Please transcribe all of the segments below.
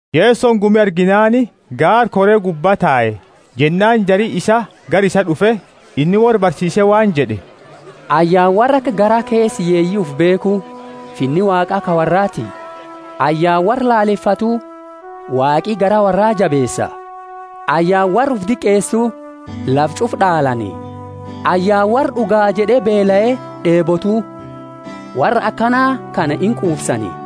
Yesoni gumi arginaani gaara kore gubba tae. Jennaani jari isaa gara isaa d'ufe, inni worra barsiise waan jed'e, Ayyaana worra aka garaa keesa hiyyeeyi ufi beekhu: Finni Waaqa ka worraati! Ayyaana worra lalefatu: Waaqi garaa worra jabeesa! Ayyaana worra ufi diqeesu: lafa ch'ufa d'aalani! Ayyaana worra d'ugaa jed'e beelae d'eebotu: worra akana kana inquufsani!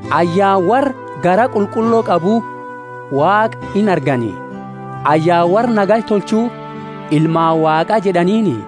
Ayyaana worra garaa qulqullo qabu: Waaqa inargani! Ayyaana worra nagaya tolchu: ilmaani Waaqa jed'aniini!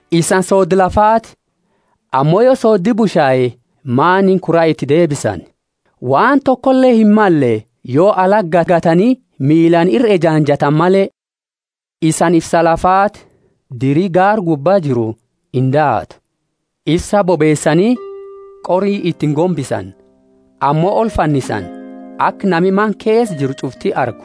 Isani soodda lafaati. Ammo yo sooddi bushae, maaniini kura iti deebisani? Waan tokole himmalle, yo alati gagatani miilaani ira ejaanjatani male. Isani ifsa lafaati. Diri gaara gubba jiru indaatu. Ifsa bobeesani qori iti ingombisani, ammo olfannisani, aka nami mana keesa jiru ch'ufti argu.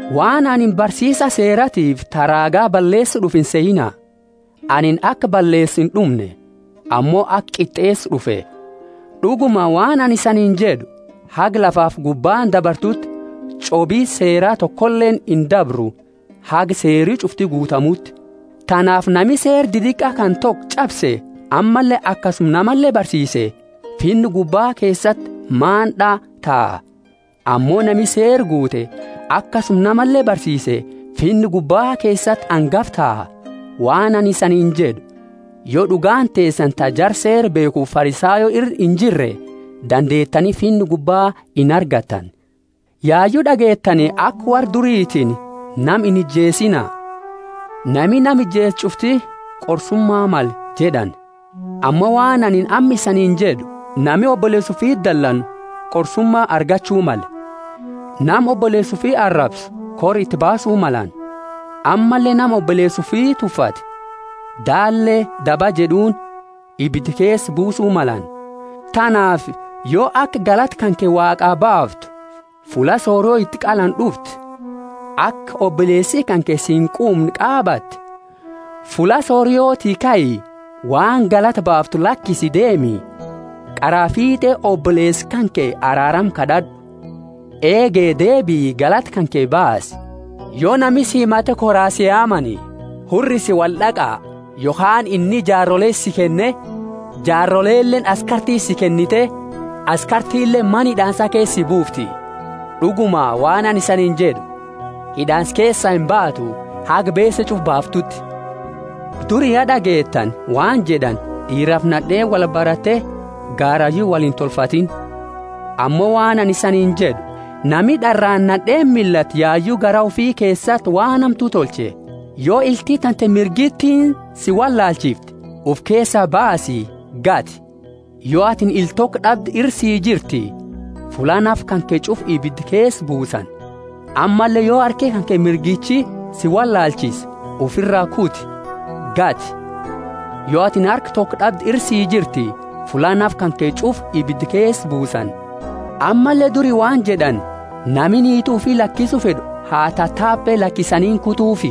Waan anini barsiisa Seeratiifi ta raaga balleesu d'ufe insehiina. Anini aka balleesu ind'umne, ammo aka qit'eesu d'ufe. D'uguma, waan anini isaniini jed'u, Haga lafafi gubbaani dabartuti ch'obi Seera tokoleeni indabru haga seeri ch'ufti guutamuti. Tanaafi nami seera didaqa kana toko ch'abse ammalle akasuma namale barsiise, Finna gubbaa keesati maand'a taha. Ammo nami Seera guute akasuma namale barsiise, Finna gubbaa keesati angafa taha. Waan anini isaniini jed'u, Yo d'ugaani teesani ta jara Seera beekhufi Farisayo ira injirre, dandeetani Finna gubba inargattani. Yayu d'ageettani aka worra duritiini, Nama inijeesiina; nami nama ijeesu ch'ufti qorsuma male jed'ani. Ammo waan anini amma isaniini jed'u, Nami oboleesa ufiti dalanu qorsuma argachu male. Nama oboleesa ufi arabsu kora iti baasu malani; ammalle nama oboleesa ufi tuffate, Daalle daba jed'uuni, ibida keesa buusu malani. Tanaafi yo aka galata kanke Waaqa baaftu, fulla sorio iti qalani d'ufte, ka aka oboleesi kanke si inquumne qaabatte, fulla sorioti kai, waan galata baaftu lakisi deemi, qaraa fiit'e oboleesa kanke araarama kad'ad'u, eege deebii galata kanke baasi. Yo nami si himate koraa si yaamani, hurrisi wold'aqa yokhaani inni jaarole si kenne, jaaroleleeni askartiti si kennite, askartileeni mana hid'aansa keesa si buufti. D'uguma, waan anini siini jed'u, hid'aansa keesaa imbaatu haga beese ch'ufa baaftuuti. Duri, ya d'ageettani, waan jed'ani, d'iirafi nad'eeni wolbarate gaarayu woliini intolfatini. Ammo waan anini isaniini jed'u, Nami d'araani nad'eeni millatu yayu garaa ufi keesati waan hamtu tolche. Yo ilti tante mirgitiini si wollaalchifte, ufi keesaa baasi, gati! Yo atini ila toko d'abde ira sii jirtii, fulla nafa kanke ch'ufa ibida keesa buusani. Ammalle yo harki kanke mirgichi si wollaalchise, ufira kuti, gati! Yo atini harka toko d'abde ira sii jirti, fulla nafa kanke ch'ufa ibida keesa buusani. Ammalle duri waan jed'ani, Nami niiti ufi lakisu fed'u ha tatabe lakisaniini kutufi.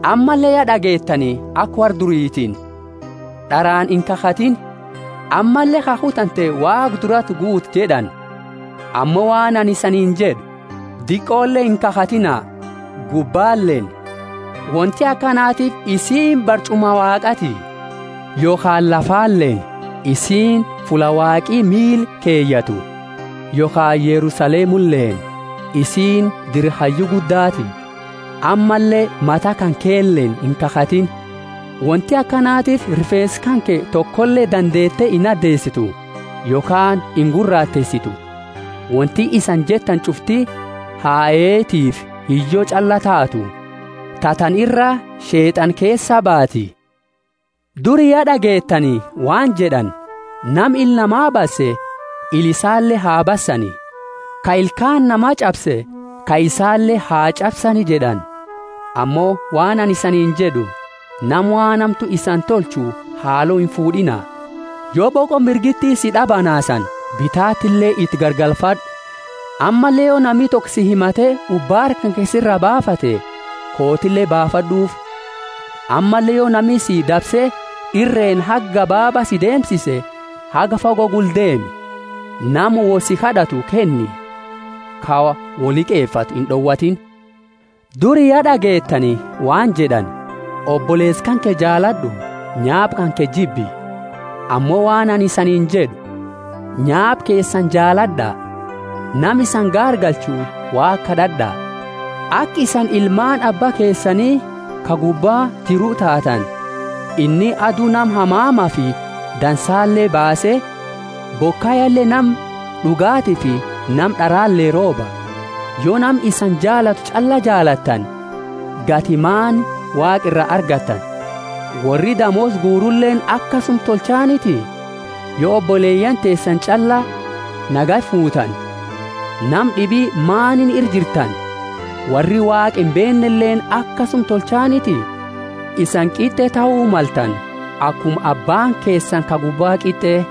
Ammalle, ya d'ageettani aka worra duritiini, D'araani inkakhatiini, ammalle kakhu tante Waaqa durati guuti jed'ani. Ammo waan anini isaniini jed'u, Diqole inkakhatina, gubbaleeni; wonti akanatiifi isiini barch'uma Waaqati; yokhaani lafaleeni; isiini fulla Waaqi miila keyatu; yokhaani Yerusalemuleeni, isiini dira Hayyu Guddaati. Ammalle mata kankeleeni inkakhatiini; wonti akanatiifi rifeensa kanke tokole dandeete inadeesitu, yokhaani inguraateesitu. Wonti isani jettani ch'ufti ha Eetiifi Hiyyo ch'allaa taatu, ta tana ira Sheet'ana keesaa baati. Duri, ya d'ageettani, waan jed'ani, Nama ila nama basse, ila isaale ha bassani; ka ilkaani nama ch'abse, ka isaale ha ch'absani jed'ani. Ammo waan anini isaniini jed'u, nama waan hamtu isani tolchu haalo infuud'iina. Yo boqo mirgiti si d'abanaasani bitatile iti garagalfad'u. Ammalle yo nami toko si himate ubaara kanke siraa baafate, kootile baafad'ufi. Ammalle yo nami si dabse irreeni haga gabaaba si deemsise haga fago gula deemi. Nama wo si kad'atu kenni; ka wo liqefatu ind'owatiini. Duri, ya d'ageettani, waan jed'ani, Oboleesa kanke jaalad'u, nyaapa kanke jibbi. Ammo waan anini isaniini jed'u, Nyaapa keesani jaalad'a, nama isani gaargalchu Waaqa kad'ad'a, aka isani ilmaani Abba keesani ka gubba jiru taatani. Inni adu nama hamamafi dadansale baase, bokayale nama d'ugatiifi nama d'arale rooba. Yo nama isani jaalatu ch'alla jaalattani, gati maani Waaqa ira argattani? Worri damoosa guuruleeni akasuma tolchaniti? Yo oboleyaani teesani ch'alla nagaya fuutani, nama d'ibi maaniini ira jirtani? Worri Waaqa imbeenneleeni akasuma tolchaniti? Isani qit'e tahu maltani, akuma abbaani keesani ka gubba qit'e.